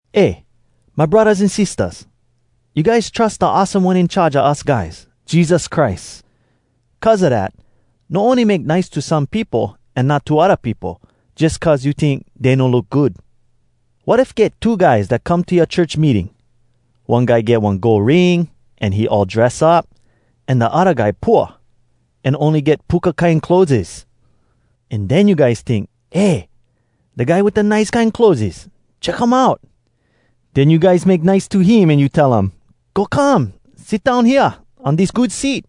Eh, my braddahs an sistahs! You guys trus da awesome One In Charge a us guys, Jesus Christ. Cuz a dat, no ony make nice to some peopo, an not to odda peopo, jus cuz you tink dey no look good. Wat if get two guys dat come to yoa church meeting. One guy get one gold ring, an he all dress up. An da odda guy pooa, an ony get puka kine clotheses. An den you guys tink, “Eh! Da guy wit da nice kine clotheses, check um out!” Den you guys make nice to him, an you tell um, “Go come! Sit down hea on dis good seat!”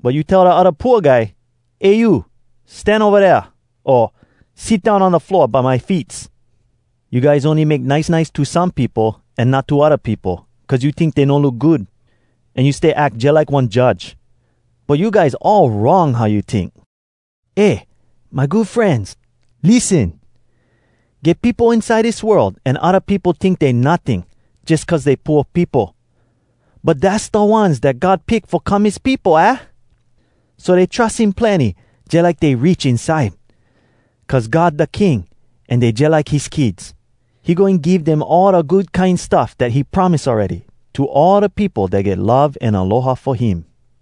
But you tell da pooa guy, “Eh, you! Stan ova dea!” o, “Sit down on da floor by my feets!” You guys ony make nice nice to some peopo, an not to odda peopo, cuz you tink dey no look good, an you stay ack jalike one judge. But you guys all wrong, how you tink. Eh, my good frenz! Lissen! Get peopo inside dis world, an odda peopo tink dey notting, jus cuz dey pooa peopo. But dass da ones dat God pick fo come his peopo, aah? So dey trus him plenny, jalike dey rich inside. Cuz God da King, an dey jalike his kids. He goin give dem all da good kine stuff dat he promise awready to all da peopo dat get love an aloha fo him.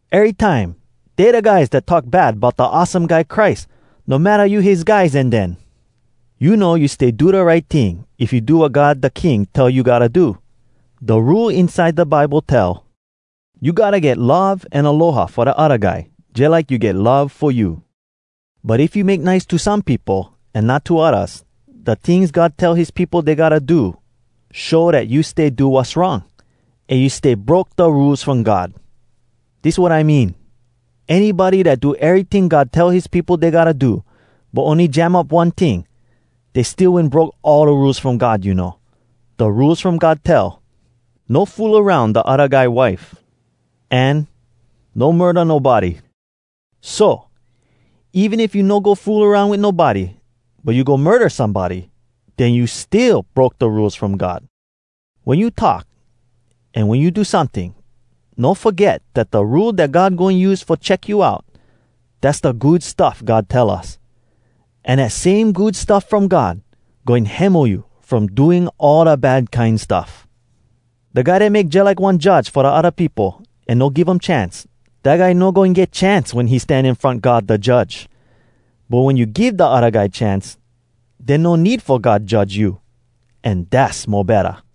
Erytime, dey da guys dat talk bad bout da awesome guy Christ, no matta you his guys, an den! You know you stay do da right ting if you do wat God da King tell you gotta do. Da Rule inside da Bible tell, “You gotta get love an aloha fo da odda guy, jalike you get love fo you.” But if you make nice to some peopo, an not to oddas, da tings God tell his peopo dey gotta do show dat you stay do wass wrong, an you stay broke da Rules From God. Dis wat I mean: Anybody dat do eryting God tell his peopo dey gotta do, but ony jam up one ting, dey still wen broke all da Rules From God, you know. Da Rules From God tell, “No fool aroun da odda guy wife.” An, “No murda nobody.” So, even if you no go fool aroun wit nobody, but you go murda somebody, den you still broke da Rules From God. Wen you talk an wen you do someting, no foget dat da Rule dat God goin use fo check you out, dass da Good Stuff God tell us. An dat same Good Stuff From God goin hemo you from doing all da bad kine stuff. Da guy dat make jalike one judge fo da odda peopo, an no give um chance, dat guy no goin get chance wen he stan in front God da Judge. But wen you give da odda guy chance, den no need fo God judge you, an dass mo betta.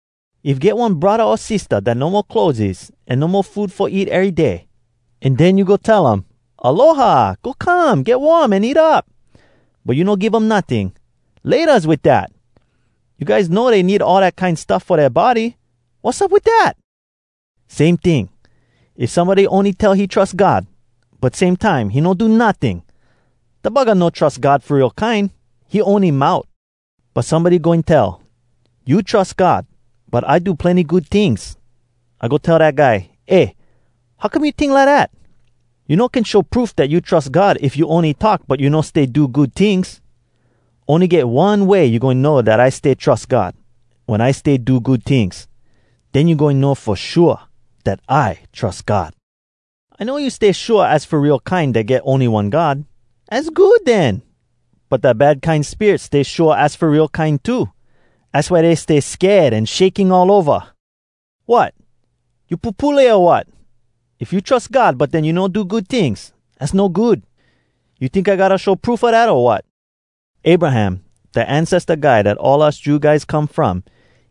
If get one braddah o sistah dat no mo clotheses an no mo food fo eat ery day, an den you go tell um, “Aloha! Go come, get warm, an eat up.” But you no give um notting. Laytas wit dat! You guys know dey need all dat kine stuff fo dea body. Wassup wit dat? Same ting, if somebody ony tell he trus God, but same time he no do notting, da buggah no trus God fo real kine, he ony mout! But somebody goin tell: “You trus God, but I do plenny good tings.” I goin tell dat guy: “Eh! How come you tink lidat? You no can show proof dat you trus God, if you ony talk, but you no stay do good tings. Ony get one way you goin know dat I stay trus God—wen I stay do good tings! Den you goin know fo shua dat I trus God.” I know you stay shua az fo real kine, dat get ony one God. Az good den! But da bad kine spirits stay shua az fo real kine too. Az why dey stay sked an shaking all ova! Wot! You pupule o wat?! If you trus God, but den, you no do good tings, az no good. You tink I gotta show proof a dat, o wat? “Abraham, da ancesta guy dat all us Jew guys come from,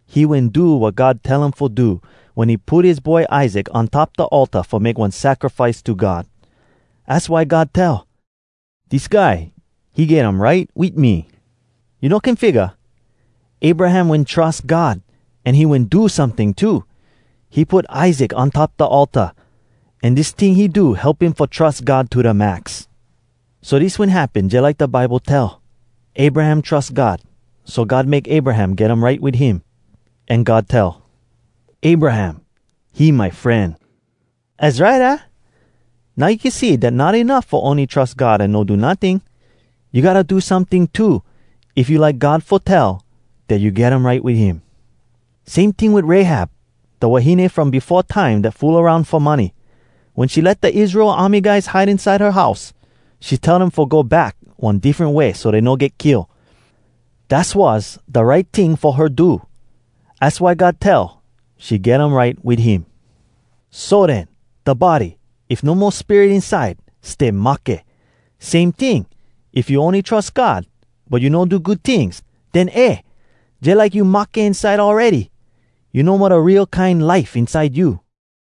he wen do wat God tell him fo do wen he put his boy Isaac on top da altar fo make one sacrifice to God. Az why God tell, ‘Dis guy, he get um right wit me.’ You no can figga? Abraham wen trus God, an he wen do someting too—he put Isaac on top da altar. An dis ting he do help him fo trus God to da max. So dis wen happen jalike da Bible tell: ‘Abraham trus God, so God make Abraham get um right wit him.’ An God tell, ‘Abraham, he my fren.’ Az right, aah? Now you can see dat not enuff fo ony trus God an no do notting. You gotta go do someting too, if you like God fo tell dat you get um right wit him.” Same ting wit Rahab, da wahine from befo time dat fool aroun fo money. Wen she let da Israel army guys hide inside her house, she tell dem fo go back one diffren way so dey no get kill. Dass was da right ting fo her do. Az why God tell she get um right wit him. So den, da body, if no mo spirit inside, stay mahke. Same ting, if you ony trus God, but you no do good tings, den eh! jalike you mahke inside awready, you no mo da real kine life inside you.